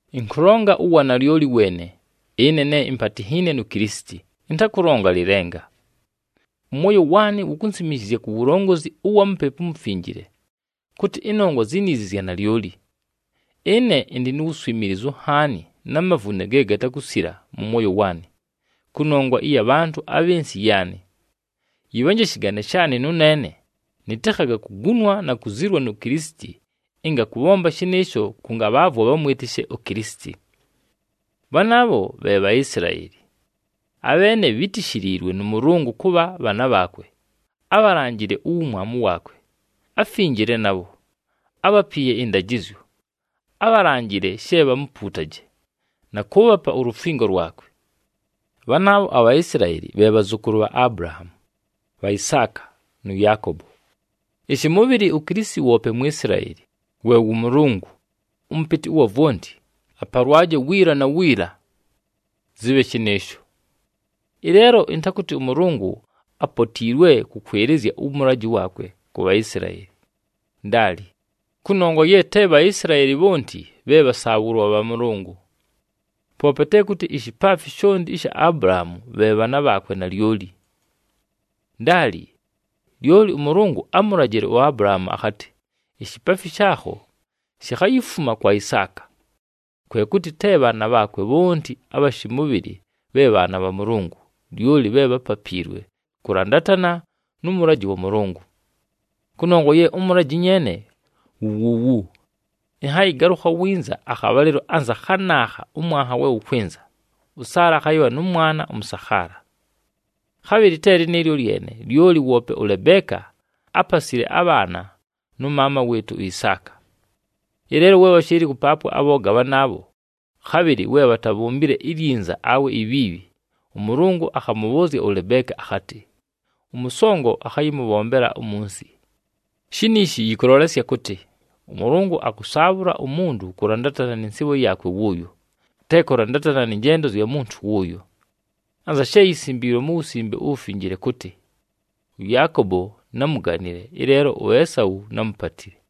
Ɨnkʉlonga uwanalyoli weene, ɨne ne impatinhiine nu Kilisiti, ɨntakʉlonga lɨlenga. Ʉmwoyo waanɨ wukunsimishizya ku wulongozi ʉwa Mupepu uMufinjile, kʉtɨ ɨnongwa ziniizi zya nalyoli. Ɨne ɨndɨ nu wuswimiilizu nhaani na mavune ge gatakusila mʉ mwoyo waanɨ, kʉnongwa ɨya bhantʉ abhɨ nsɨ yaanɨ. Yɨbhanje shɨgane shaanɨ nʉneene, nɨtɨkhaga kugunwa na kuzilwa nu Kilisiti, ɨnga kʉbhomba shɨnɨɨsho kʉngabhaavwa bhamwɨtɨshe uKilisiti. Bhanaabho bhe Bhaisilaeli. Abheene bhítishiliilwe nʉ Mʉlʉngʉ kʉbha bhaana bhaakwe, ábhalanjile uwumwamu waakwe, áfinjile nabho, ábhapiiye ɨndajɨzyo, ábhalanjile she bhamupuutaje, na kʉʉbhapa ulufingo lwakwe. Bhanaabho aBhaisilaeli bhe bhazʉkʉlʉ bha Abulahaamu, bha Isaaka nʉ Yaakobo. Ɨshɨmʉbhɨlɨ uKilisiti woope Mwisilaeli, we wʉ Mʉlʉngʉ, ʉMʉpɨtɨ ʉwa vwonti. Apalwaje wiila na wiila! Zɨbhe shɨnɨɨsho. Ɨleelo ɨntakʉtɨ ʉMʉlʉngʉ apotiilwe kʉkwɨlɨzya ʉmʉlajɨ waakwe ku Bhaisilaeli. Ndaali! Kʉnongwa ye te Bhaisilaeli bhonti bhe bhasaabhʉlwa bha Mʉlʉngʉ. Poope te kʉtɨ ishipaafi shonti ɨsha Abulahaamu bhe bhaana bhaakwe nalyoli. Ndaali! Lyoli ʉMʉlʉngʉ ámulajile uAbulahaamu akhatɨ, “Ishipaafi shaakho shikhayifuma kwa Isaaka.” Kwe kʉtɨ te bhaana bhaakwe bhonti abha shɨmʉbhɨlɨ bhe bhaana bha Mʉlʉngʉ, lyoli bhe bhápapiilwe kʉlandatana nʉ mʉlajɨ wa Mʉlʉngʉ. Kʉnongwa ye ʉmʉlajɨ nyeene wu wuuwu, “Ɨnhayɨgalʉkha winza akhabhalɨlo anza khanaakha ʉmwanha we wʉkwɨnza, ʉSaala akhayɨbha nʉ mwana ʉmʉsakhaala.” Khabhɨlɨ te lɨnɨɨlyo lyene, lyoli woope ʉLebeeka ápasile abhaana nʉ maama wɨɨtʉ uIsaaka. Ɨleelo we bhashɨɨlɨ kʉpaapwa abhooga bhanaabho, khabhɨlɨ we bhatabhombile ilyinza awe ibhiibhi, ʉMʉlʉngʉ akhamʉbhʉʉzya ʉLebeeka akhatɨ, “Ʉmʉsongo akhayɨmʉbhombela umunsi.” Shiniishi yɨkʉlolesya kʉtɨ, ʉMʉlʉngʉ akʉsaabhʉla umuntu kʉlandatana nɨ nsɨɨbho yaakwe wʉʉyo, te kʉlandatana nɨ njendo zya muntu wʉnʉʉyo. Anza she yisimbiilwe mu Wusimbe uWufinjile kʉtɨ, “ɄYaakobo námuganile, ɨleelo uEsau námupatile.”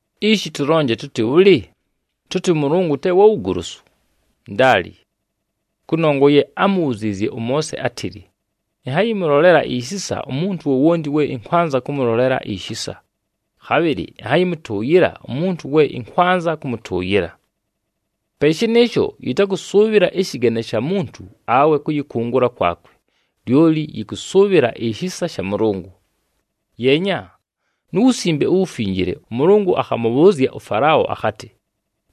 Ishi tʉlonje tʉtɨ bhʉlɨ? Tʉtɨ ʉMʉlʉngʉ te wa wugolosu? Ndaali! Kʉnongwa ye ámubhuziizye ʉMoose átɨlɨ, “Ɨnhayɨmʉlolela ishisa umuntu wowonti we ɨnkwanza kʉmʉlolela ishisa, khabhɨlɨ ɨnhayɨmʉtʉʉyɨla umuntu we ɨnkwanza kʉmʉtʉʉyɨla.” Pe shɨnɨɨsho, yɨtakʉsʉʉbhɨla ɨshɨgane sha muntu awe kʉyɨkʉngʉla kwakwe, lyoli yɨkʉsʉʉbhɨla ishisa sha Mʉlʉngʉ. Yeenya, mu Wusimbe uWufinjile ʉMʉlʉngʉ akhamʉbhʉʉzya ʉFalao akhatɨ,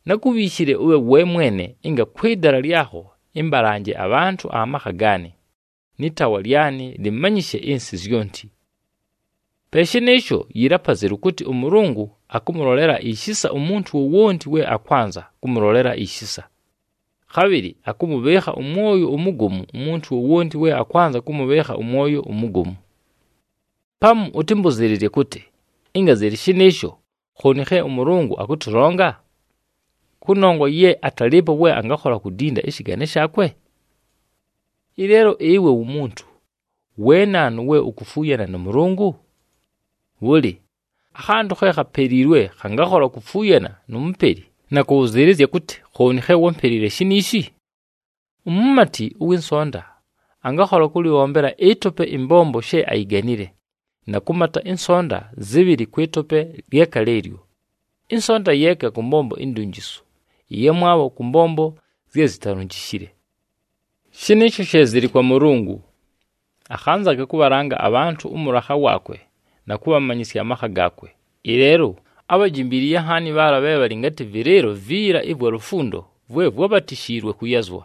“Nákubhiishile ʉbhe we mwene ɨnga kwɨ dala lyakho ɨmbalanje abhantʉ amakha gaanɨ, nɨ taawa lyanɨ lɨmanyɨshe ɨnsɨ zyonti.” Pe shɨnɨɨsho, yɨlɨ apazelu kʉtɨ ʉMʉlʉngʉ akʉmʉlolela ishisa umuntu wowonti we akwanza kʉmʉlolela ishisa, khabhɨlɨ akʉmʉbhɨɨkha ʉmwoyo umugomu umuntu wowonti we akwanza kʉmʉbhɨɨkha ʉmwoyo umugomu. Pamu ʉtɨmbʉzɨɨlɨzye kʉtɨ, “Ɨnga zɨlɨ shɨnɨɨsho, khooni khe ʉMʉlʉngʉ akʉtʉlonga? Kʉnongwa ye atalɨɨpo we angakhola kudinda ɨshɨgane shaakwe?” Ɨleelo ɨwe wumuntu, we naanu we ukufuuyana nʉ Mʉlʉngʉ? Bhʉlɨ, akhantʉ khe khapeliilwe khangakhola kufuuyana nu mupeli na kʉbhʉzɨɨlɨzya kʉtɨ, “Khooni khe wámpelile shiniishi?” Umumati ʉwɨ nsonta angakhola kʉlɨbhombela ɨtope ɨmbombo she ayiganile, na kʉmata ɨnsonta zɨbhɨlɨ kwɨ tope lyeka lɨɨlyo, ɨnsonta yeeka kʉ mbombo indunjisu, ɨyamwabho kʉ mbombo zye zitalunjishile. Shɨnɨɨsho she zɨlɨ kwa Mʉlʉngʉ. Akhanzaga kʉbhalanga abhantʉ ʉmʉlakha waakwe na kʉbhamanyɨsya amakha gaakwe, ɨleelo ábhajimbiliiye nhaani bhaala bhe bhalɨ ngatɨ vɨlɨɨlo viila ɨvwa lufundo vwe vwábhatishiliilwe kʉyazwa.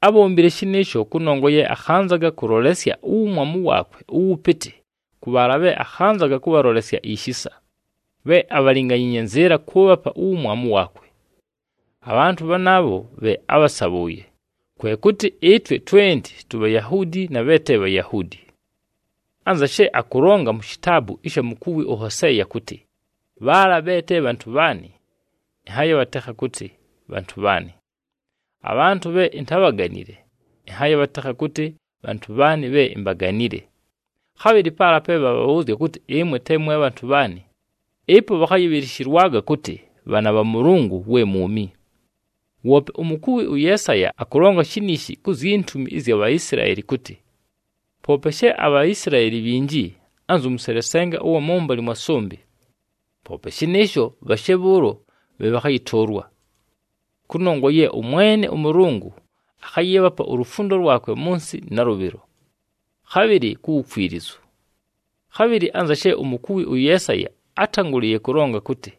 Ábhombile shɨnɨɨsho kʉnongwa ye akhanzaga kʉlolesya uwumwamu waakwe ʉwʉpɨtɨ kʉ bhaala bhe akhanzaga kʉbhalolesya ishisa, bhe abhalinganyiinye nzɨɨla kʉʉbhapa uwumwamu waakwe. Abhantʉ bhanaabho bhe ábhasabhʉʉye, kwe kʉtɨ ɨtwe twenti tuBhayahuudi na bhe te Bhayahuudi. Anza she akʉlonga mu shitaabu ɨsha mukuwi ʉHoseeya kʉtɨ, “Bhaala bhe te bhantʉ bhaanɨ, ɨnhayɨbhatekha kʉtɨ, ‘Bhantʉ bhaanɨ.’ Abhantʉ bhe intábhaganile, ɨnhayɨbhatekha kʉtɨ, ‘Bhantʉ bhaanɨ bhe imbaganile.’” Khabhɨlɨ, “Paala pe bhabhabhʉʉzya kʉtɨ, ‘Ɨmwe te mwe bhantʉ bhaanɨ,’ ɨpo bhakhayɨbhɨlɨshɨlwaga kʉtɨ, ‘Bhaana bha Mʉlʉngʉ we mwumi.’” Woope umukuwi ʉYeesaya akʉlonga shiniishi ku zyi ntumi ɨzya Bhaisilaeli kʉtɨ, “Poope she aBhaisilaeli bhinji, anzʉ mʉselesenga ʉwa mʉmbalɨ mwa sʉmbɨ, poope shɨnɨɨsho bhashe bhʉʉlo bhe bhakhayɨtʉʉlwa. Kʉnongwa ye ʉMwene ʉMʉlʉngʉ akhayɨɨbhapa ulufundo lwakwe mʉ nsɨ nalʉbhɨlo, khabhɨlɨ ku wukwilizu.” Khabhɨlɨ anza she umukuwi ʉYeesaya átangʉlɨɨye kʉlonga kʉtɨ,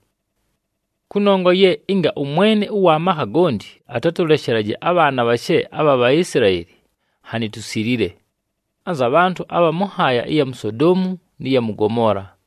“Kʉnongwa ye ɨnga ʉMwene ʉwa makha gonti atatʉleshelaje abhaana bhashe abha Bhaisilaeli, nhanɨ tusilile, anza bhantʉ abha mʉ nhaaya ɨya mu Sodoomu nɨ ya mʉ Gomoola.”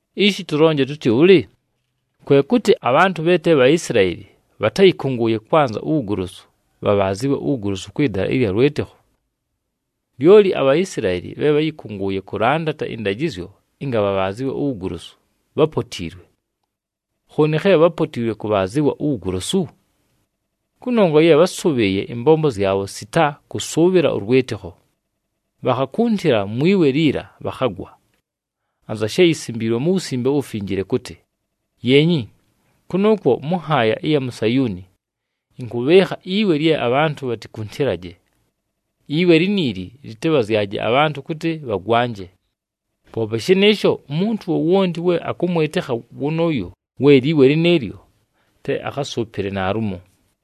Ishi tʉlonje tʉtɨ bhʉlɨ? Kwe kʉtɨ, abhantʉ bhe te Bhaisilaeli bhatáyɨkʉngʉʉye kwanza uwugolosu, bhabhaazɨwe uwugolosu kwɨ dala ɨlya lwɨtɨkho. Lyoli aBhaisilaeli bhe bháyɨkʉngʉʉye kʉlandata ɨndajɨzyo ɨnga bhabhaazɨwe uwugolosu, bhápotiilwe. Khooni khe bhápotiilwe kʉbhaazɨwa uwugolosu? Kʉnongwa ye bhásʉbhɨɨye ɨmbombo zyabho, sita kʉsʉʉbhɨla ʉlwɨtɨkho. Bhakhakuntila mwi we liila, bhakhagwa. Anza she yisimbiilwe mu Wusimbe uWufinjile kʉtɨ, “Yeenyi, kʉnʉʉkwo mʉ nhaaya ɨya mu Sayuuni ɨnkʉbhɨɨkha iwe lye abhantʉ bhatikuntilaje. Iwe liniili lɨtɨbhazyaje abhantʉ kʉtɨ bhagwanje. Poope shɨnɨɨsho, umuntu wowonti we akʉmwɨtɨkha wʉnʉʉyo we liwe lɨnɨɨlyo, te akhasʉʉpɨle naalumo!”